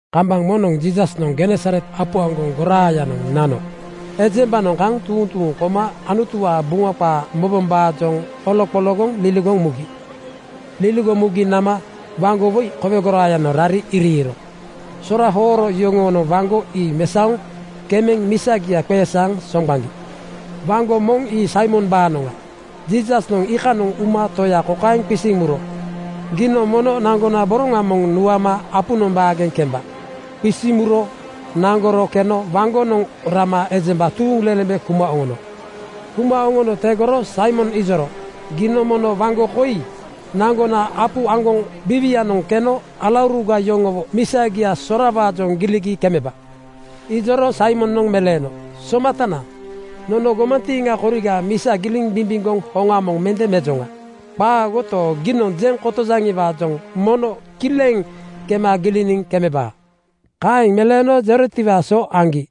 Kambaŋ moŋnoŋ Jiisasnoŋ Genesaret apu aŋgoŋ goraayanoŋ nano ejembanoŋ kaŋ tuuŋ tuuŋ koma Anutuwaa Buŋa qaa mobombaajoŋ oloqologoŋ liligoŋ mugi. Liligoŋ mugi nama waŋgo woi kowe goraayanoŋ rari iriiro. Sora hooro yoŋonoŋ waŋgo ii mesaoŋ kemeŋ misagia qeesaaŋ soŋgbaŋgi. Waŋgo moŋ ii Saimombaanoŋa. Jiisasnoŋ iikanoŋ uma toya kokaeŋ qisiŋ muro, “Giinoŋ mono naŋgona boroŋa moŋ nuama apunoŋ baageŋ kemba.” Qisiŋ muro naŋgoro keno waŋgonoŋ rama ejemba tuuŋlelembe kuma oŋono. Kuma oŋono tegoro Saimon ijoro, “Giinoŋ mono waŋgo koi naŋgona apu aŋgoŋ biiwianoŋ keno alauruga yoŋowo misagia sorawaajoŋ giligi kemeba.” Ijoro Saimonoŋ meleeno, “Somatana, nono gomantiiŋa koriga misa giliŋ bimbimgoŋ hoŋa moŋ mende mejoŋa. Qaagoto, giinoŋ jeŋ kotojaŋiwaajoŋ mono kileŋ kema giliniŋ kemebaa.” Kaeŋ meleeno jerotiwaa so aŋgi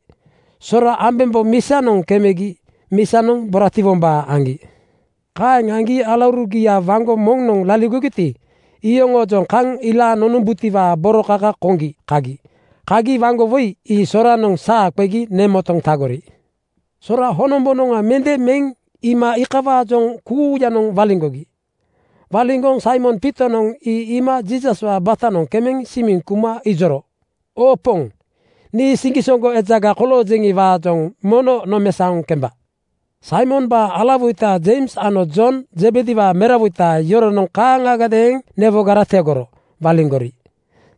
sora ambembo misagianoŋ kemegi misanoŋ boratiwombaa aŋgi. Kaeŋ aŋgi alaurugia waŋgo moŋnoŋ laligogiti, iyoŋoojoŋ kaŋ ilaaŋ oŋombutiwaa boro kaka koŋgi kagi. Kagi waŋgo woi ii soranoŋ saa qegi nemotoŋ tagori. Sora honombonoŋa mende meŋ iima iikawaajoŋ kuuyanoŋ waliŋgogi. Waliŋgoŋ Saimon Piitonoŋ ii iima Jiisaswaa batanoŋ kemeŋ simiŋ kuma ijoro, “Oo Poŋ, nii siŋgisoŋgo ejaga koloojeŋi-waajoŋ mono nomesaoŋ kemba.” Saimombaa alawoita Jeims ano Jon Zebediwaa merawoita yoronoŋ kaaŋagadeeŋ newogara tegoro waliŋgori.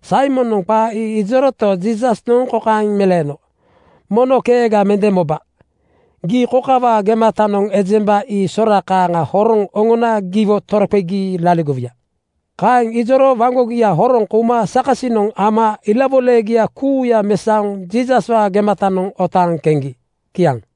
Saimonoŋ qaa ii ijoroto, Jiisasnoŋ kokaeŋ meleeno, “Mono keega mende moba. Gii kokawaa gematanoŋ ejemba ii sora kaaŋa horoŋ oŋona giwo toroqegi laligowuya.” Kaeŋ ijoro waŋgogia horoŋ kouma sakasinoŋ ama ilawoilagia kuuya mesaoŋ Jiisaswaa gematanoŋ otaaŋ keŋgi. Kiaŋ.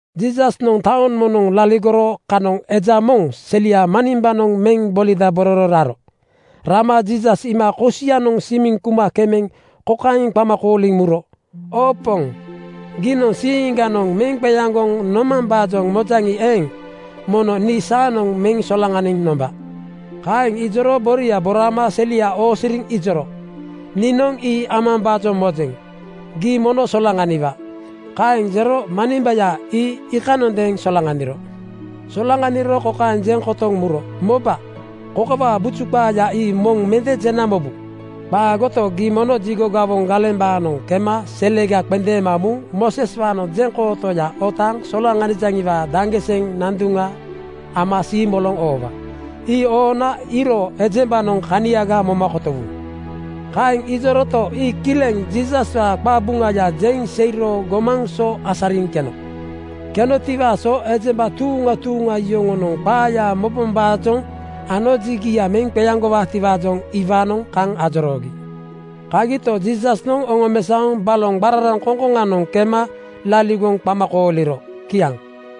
Jiisasnoŋ taoŋ moŋnoŋ laligoro kanoŋ eja moŋ selia manimbanoŋ meŋ bolidabororo raro. Rama Jiisas iima kosianoŋ simiŋ kuma kemeŋ kokaeŋ qama kooliŋ muro, “Oo Poŋ, giinoŋ siiŋganoŋ meŋ qeaŋgoŋ nomambaajoŋ mojaŋi eeŋ, mono nii saanoŋ meŋ solaŋaniŋ nomba.” Kaeŋ jero boria boraama selia oosiriŋ ijoro, “Niinoŋ ii amambaajoŋ mojeŋ. Gii mono solaŋaniwa.” Kaeŋ jero manimbaya ii iikanondeeŋ solaŋaniro. Solaŋaniro kokaeŋ jeŋ kotoŋ muro, “Moba, kokawaa buju qaaya ii moŋ mende jena mobu. Qaagoto, gii mono jigo gawoŋ galembaanoŋ kema selega qendeema muŋ Mooseswaanoŋ jeŋkootoya otaaŋ solaŋanijaŋiwaa daŋgiseŋ nanduŋa ama siimoloŋ oowa. Ii oona iiro ejembanoŋ kaniaga moma kotowu.” Kaeŋ ijoroto, ii kileŋ Jiisaswaa qabuŋaya jeŋ seiro gomaŋ so asariŋ keno. Kenotiwaa so ejemba tuuŋa tuuŋa yoŋonoŋ qaaya mobombaajoŋ ano jigia meŋ qeaŋgowaatiwaajoŋ iwaanoŋ kaŋ ajoroogi. Kagito, Jiisasnoŋ oŋomesaoŋ baloŋ qararaŋkoŋ-koŋanoŋ kema laligoŋ qama kooliro. Kiaŋ.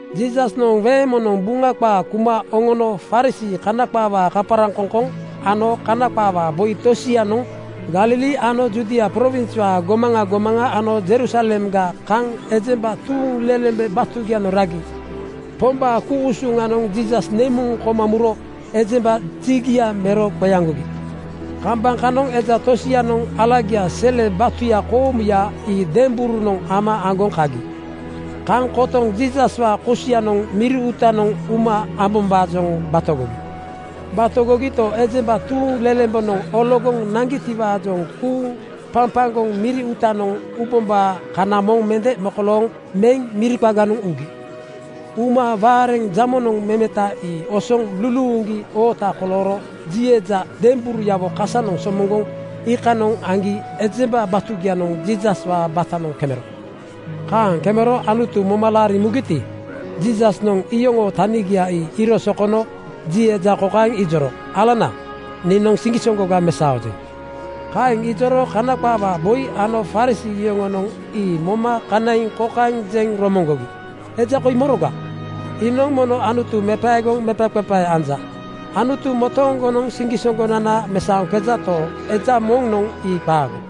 Jiisasnoŋ weeŋ moŋnoŋ Buŋa qaa kuma oŋono Farisii (Kana qaawaa kaparaŋkoŋkoŋ) ano Kana qaawaa boi tosianoŋ Galili ano Judia prowinswaa gomaŋa gomaŋa ano Jerusalemga kaŋ ejemba tuuŋlelembe batugianoŋ ragi. Pombaa ku-usuŋanoŋ Jiisas nemuŋ koma muro ejemba jigia mero qeaŋgogi. Kambaŋ kanoŋ eja tosianoŋ alagia sele batuya koomuya ii demberunoŋ ama aŋgoŋ kagi. Kaŋ kotoŋ Jiisaswaa kosianoŋ miri uutanoŋ uma ambombaajoŋ batogogi. Batogogito, ejemba tuuŋlelembenoŋ ologoŋ naŋgitiwaajoŋ kuuŋ papaŋgoŋ miri uutanoŋ ubombaa kana moŋ mende mokolooŋ meŋ miri qaganoŋ ugi. Uma waareŋ jamonoŋ memeta ii osoŋ luluuŋgi oota kolooro ji eja demberuyawo kasanoŋ somoŋgoŋ iikanoŋ aŋgi ejemba batugianoŋ Jiisaswaa batanoŋ kemero. Kaaŋ kemero Anutu moma laariŋ mugiti, Jiisasnoŋ iyoŋoo tanigia ii iiro sokono ji eja kokaeŋ ijoro, “Alana, niinoŋ siŋgisoŋgoga mesaojeŋ.” Kaeŋ ijoro Kana qaawaa boi ano Farisii yoŋonoŋ ii moma kanaiŋ kokaeŋ jeŋ romoŋgogi, “Eja koi moroga? Iinoŋ mono Anutu mepaegoŋ mepaqepae anja. Anutu motooŋgonoŋ siŋgisoŋgonana mesaoŋkejato, eja moŋnoŋ ii qaago.”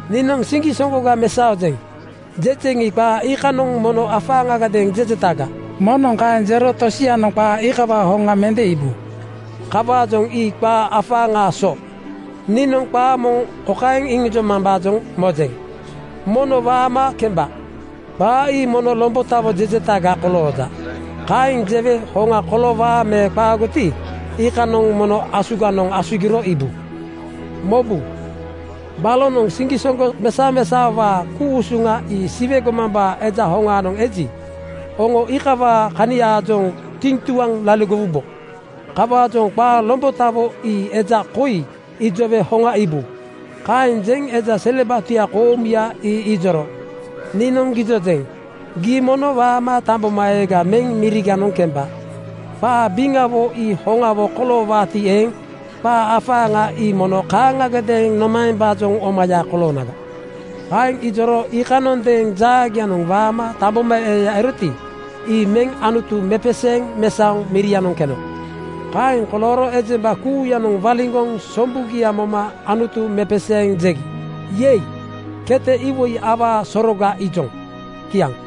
‘Niinoŋ siŋgisoŋgoga mesaojeŋ,’ jejeŋi, qaa iikanoŋ mono afaaŋagadeeŋ jejetaga. Moŋnoŋ kaeŋ jero tosianoŋ qaa iikawaa hoŋa mende iibu. Kawaajoŋ ii qaa afaaŋaa so. Niinoŋ qaa moŋ kokaeŋ jemambaajoŋ mojeŋ, ‘Mono waama kemba.’ Qaa ii mono lombotawo jejetaga kolooja. Kaeŋ jewe hoŋa koloowaa me qaagoti, iikanoŋ mono asuganoŋ asugiro iibu. Mobu, balonoŋ siŋgisoŋgo mesamesaowaa ku-usuŋa ii Siwe gomambaa Eja hoŋaanoŋ eji, oŋo iikawaa kaniaajoŋ tiŋtuaŋ laligowubo. Kawaajoŋ qaa lombotawo ii eja koi ijowe hoŋa iibu.” Kaeŋ jeŋ eja sele batuya koomuya ii ijoro, “Niinoŋ gijojeŋ: Gii mono waama tambomaeega meŋ miriganoŋ kemba. Qaa biŋawo ii hoŋawo koloowaati eeŋ, qaa afaaŋa ii mono kaaŋagadeeŋ nomaembaajoŋ omaya koloonaga?” Kaeŋ ijoro iikanondeeŋ jaagianoŋ waama tambomaeeya eroti, ii meŋ Anutu mepeseeŋ mesaoŋ mirianoŋ keno. Kaeŋ kolooro ejemba kuuyanoŋ waliŋgoŋ sombugia moma Anutu mepeseeŋ jegi, “Yei! Kete iwoi awaa soroga iijoŋ.” Kiaŋ.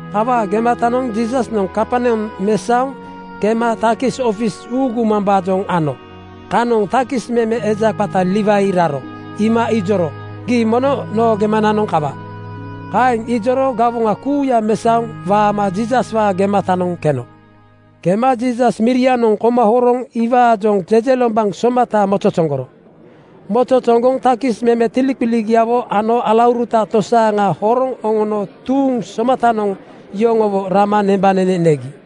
Kawaa gematanoŋ Jiisasnoŋ Kaperneam mesaoŋ kema takis ofis uugumambaajoŋ ano kanoŋ takis meme eja qata Liwai raro iima ijoro, “Gii mono noo gemananoŋ kawa.” Kaeŋ ijoro gawoŋa kuuya mesaoŋ waama Jiisaswaa gematanoŋ keno. Kema Jiisas mirianoŋ koma horoŋ iwaajoŋ jejelombaŋ somata mozozoŋgoro. Mozozoŋgoŋ takis meme tiliqiligiawo ano alauruta tosaaŋa horoŋ oŋono tuuŋ somatanoŋ yoŋowo rama nembanene negi.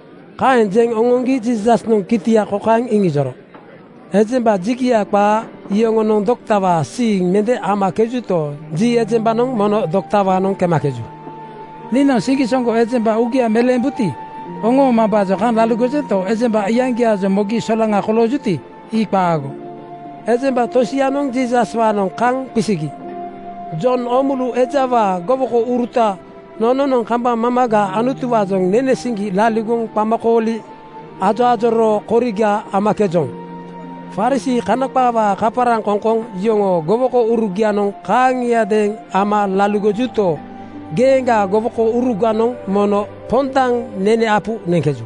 Kaeŋ jeŋ oŋoŋgi Jiisasnoŋ kitia kokaeŋ iŋijoro, “Ejemba jigia qaa yoŋonoŋ doktawaa siiŋ mende amakejuto, ji ejembanoŋ mono doktawaanoŋ kemakeju. Niinoŋ siŋgisoŋgo ejemba uugia meleembuti oŋoomambaajoŋ kaŋ laligojento, ejemba iyaŋgiaajoŋ mogi solaŋa koloojuti, ii qaago.” Ejemba tosianoŋ Jiisaswaanoŋ kaŋ qisigi, “Jon Oomulu ejawaa gowokouruta nononoŋ kambaŋ mamaga Anutuwaajoŋ nene siŋgi laligoŋ qamakooli ajoajoroo koriga amakejoŋ. Farisii (Kana qaawaa kaparaŋkoŋkoŋ) yoŋoo gowokourugianoŋ kaaŋiadeeŋ ama laligojuto, geeŋgaa gowokouruganoŋ mono pondaŋ nene apu neŋkeju.”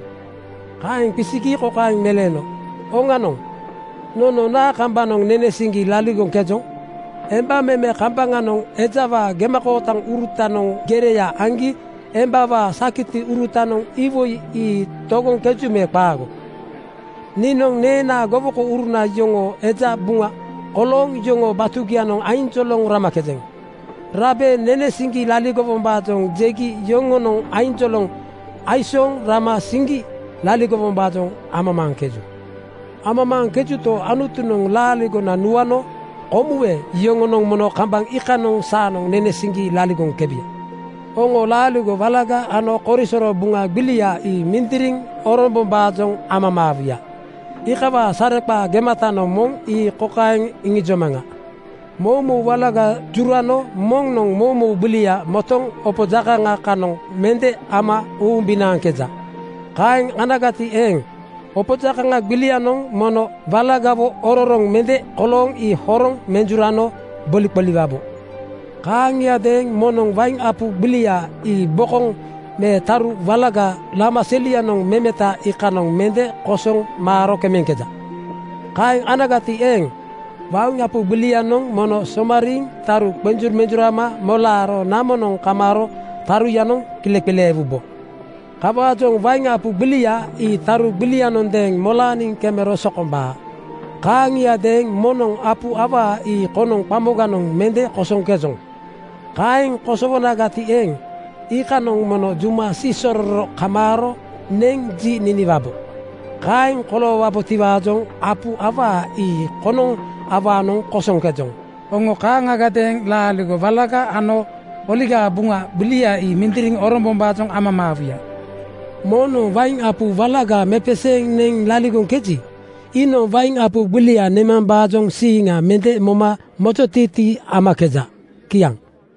Kaeŋ qisigi kokaeŋ meleeno, “Oŋanoŋ! Nono naa kambanoŋ nene siŋgi laligoŋkejoŋ? Emba meme kambaŋanoŋ ejawaa gemakootaŋurutanoŋ gereya aŋgi embawaa sakitiurutanoŋ iwoi ii togoŋkeju me qaago? Niinoŋ neenaa gowokouruna yoŋoo eja buŋa kolooŋ yoŋoo batugianoŋ ainjoloŋ ramakejeŋ. Rabe nene siŋgi laligowombaajoŋ jegi yoŋonoŋ ainjoloŋ aisooŋ rama siŋgi laligowombaajoŋ amamaaŋkeju. Amamaaŋkejuto, Anutunoŋ laaligona nuano komuwe yoŋonoŋ mono kambaŋ iikanoŋ saanoŋ nene siŋgi laligoŋkebuya. “Oŋo laaligo walaga ano korisoro Buŋa gbilia ii mindiriŋ orombombaajoŋ amamaawuya. Iikawaa sareqaa gemata moŋ ii kokaeŋ iŋijomaŋa: Moumou walaga jurano moŋnoŋ moumou gbilia motoŋ opo jakaŋa kanoŋ mende ama uumbinaaŋkeja. Kaaŋ anagati eeŋ, opo jakaŋa gbilianoŋ mono walagawo ororoŋ mende kolooŋ ii horoŋ menjurano boliqoliwabo. “Kaaŋiadeeŋ moŋnoŋ wain apu gbilia ii bokoŋ me taru walaga lama selianoŋ memeta iikanoŋ mende kosoŋ maaro kemeŋkeja. Kaeŋ anagati eeŋ, wain apu gbilianoŋ mono somariiŋ taru qenjumenjurama molaaro namonoŋ kamaaro taruyanoŋ kileqileewubo. “Kawaajoŋ wain apu gbilia ii taru gbilianondeeŋ molaaniŋ kemero sokombaa. (Kaaŋiadeeŋ moŋnoŋ apu awaa ii konoŋ qamoganoŋ mende kosoŋkejoŋ. Kaeŋ kosowonagati eeŋ, iikanoŋ mono juma siisororo kamaaro neŋ ji niniwabo. Kaeŋ koloowaboti-waajoŋ apu awaa ii konoŋ awaanoŋ kosoŋkejoŋ. Oŋo kaaŋagadeeŋ laaligo walaga ano Oligaa Buŋa gbilia ii mindiriŋ orombombaajoŋ amamaawuya.) Moŋnoŋ wain apu walaga mepeseeŋ neŋ laligoŋkeji, iinoŋ wain apu gbilia nemambaajoŋ siiŋa mende moma mojotiitii amakeja.” Kiaŋ.